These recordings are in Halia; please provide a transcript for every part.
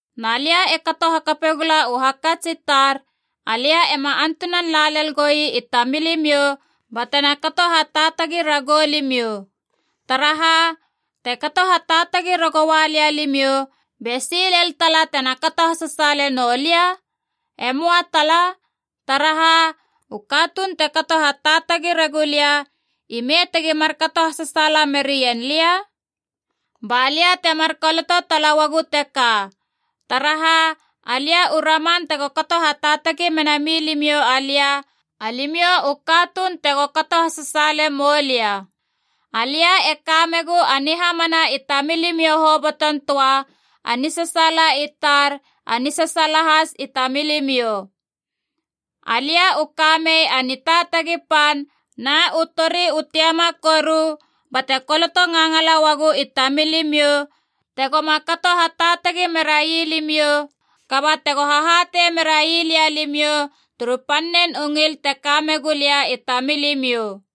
Na lia e kato hakape gula u hakats i tar, alia ema antunan la lel goi i tamilimiou batena kato hataatagi ragou limiou. Taraha, te kato hataatagi ragoua lia limiou, be si lel tala tena kato hasasaale noulia? E möa tala. Taraha, u katuun te kato hataatagi regulia, ime tegi markato hasasaala merien lia? Ba lia temar koloto tala uagu teka, taraha alia u raman tego kato hataatagi mena milimiou alia, alimiou u katuun tego kato hasasaale moulia. Alia e kamegu a nihamana i tamilimiou hoboton töa, a nisasaala i tar, a nisasaala has i tamilimiou. Alia u kamei a nitaatagi pan na u tori u tiama koru bate koloto ngangala uagu i tamilimiou, tegoma kato hataatagi merai limiou, kaba tego hahatei merailia limiou turu pannen u ngil te ka megu lia i tamilimiou.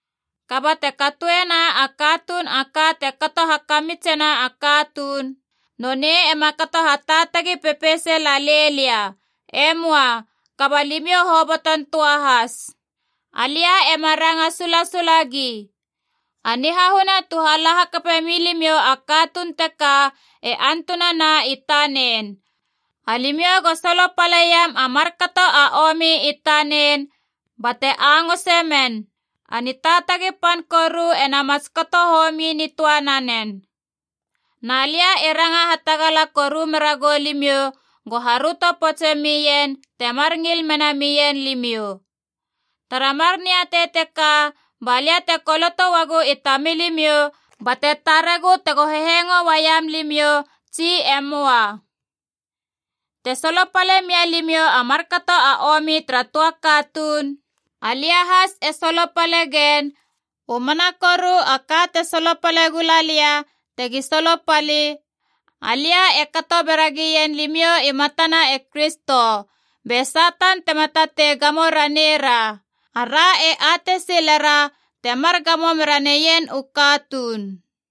Kaba te katoena a katuun a ka te kato hakamitsena a katuun, nonei ema kato hataatagi pepeise lalei lia, e möa, kaba limiou hoboton töa has. Alia ema ranga sulasula gi. A nihahuna tu hala hakape milimiou a katuun teka e antunana i tanen. Alimiou go solopaleiam a markato a omi i tanen bate angose men. A nitaatagi pan koru e namots kato homi nitöa nanen. Na lia e ranga hatagala koru meragou limiou go haröto poutse mien temar ngil mena mien limiou. Tara mar niatei teka ba lia te koloto uagu i tamilimiou, bate taregu tego hehengo uaiam limiou, tsi e möa. Te solopale mia limiou a markato a omi tara töa katuun, alia has e solopale gen, u mana koru a ka te solopale gula lia tegi solopali, alia e kato beragien limiou i matana e Kristo. Be Satan tema tatei gamo ranei ra. Ara e atei silera temar gamo mera neien u katuun.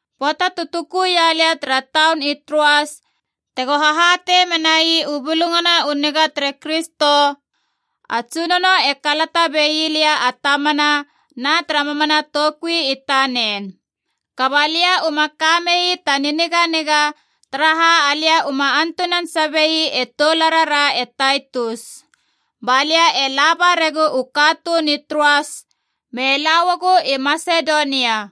Pöata tu tukuia lia tara taun i Troas tego hahatei menai u Bulungana u Niga tere Kristo, a Tsunono e kalata bei lia a tamana na tara mamana toukui i tanen. Kaba lia uma kamei ta niniganiga, taraha alia uma antunan sabei e toularara e Taitus. Ba lia e laba regu u katuun i Troas me lauagu i Masedonia.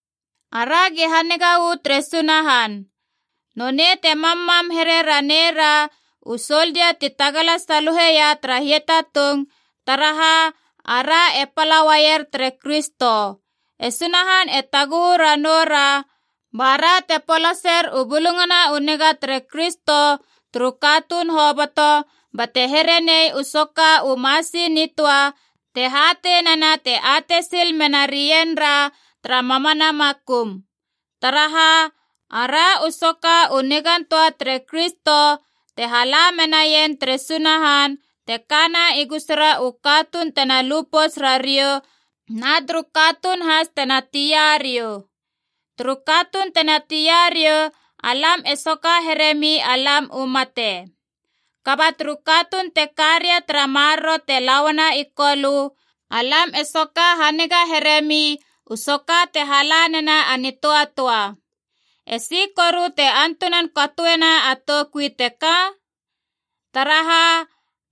Aragi haniga uu tere Sunahan. Nonei te mammam here raneira u soldia ti tagala saluheia tara hiatatung, taraha ara e pala uaier tere Kristo. E Sunahan e taguhu ranoura, bara te polaser u Bulungana u Niga tere Kristo turu katuun hoboto, bate here nei u soka u masi nitöa te hatei nena te atei sil menarienra tara mamana makum. Taraha, ara u soka u nigan töa tere Kristo te hala menaien tere Sunahan te kana i gusura u katuun tena lu pouts rariou na turu katuun has tena tia riou. Turu katuun tena tia riou, alam e soka heremi alam u mate. Kaba turu katuun te karia tara maroro te lauana i Kolö, alam e soka haniga heremi u soka te hala nena a nitöatöa. Esi koru te antunan katoena a toukui teka? Taraha,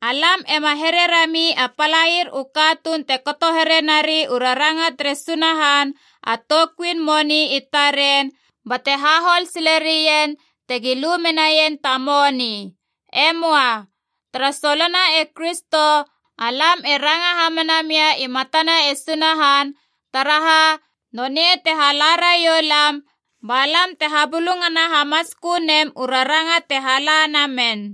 alam ema here rami a palair u katuun te kato here nari u raranga tere Sunahan a toukuin moni i taren bate hahol sile rien tegi lu menaien ta moni. E möa. Tara solona e Kristo alam e ranga hamana mia i matana e Sunahan, taraha, nonei te hala raiou lam ba lam te habulungana hamatskö nem u raranga te hala namen.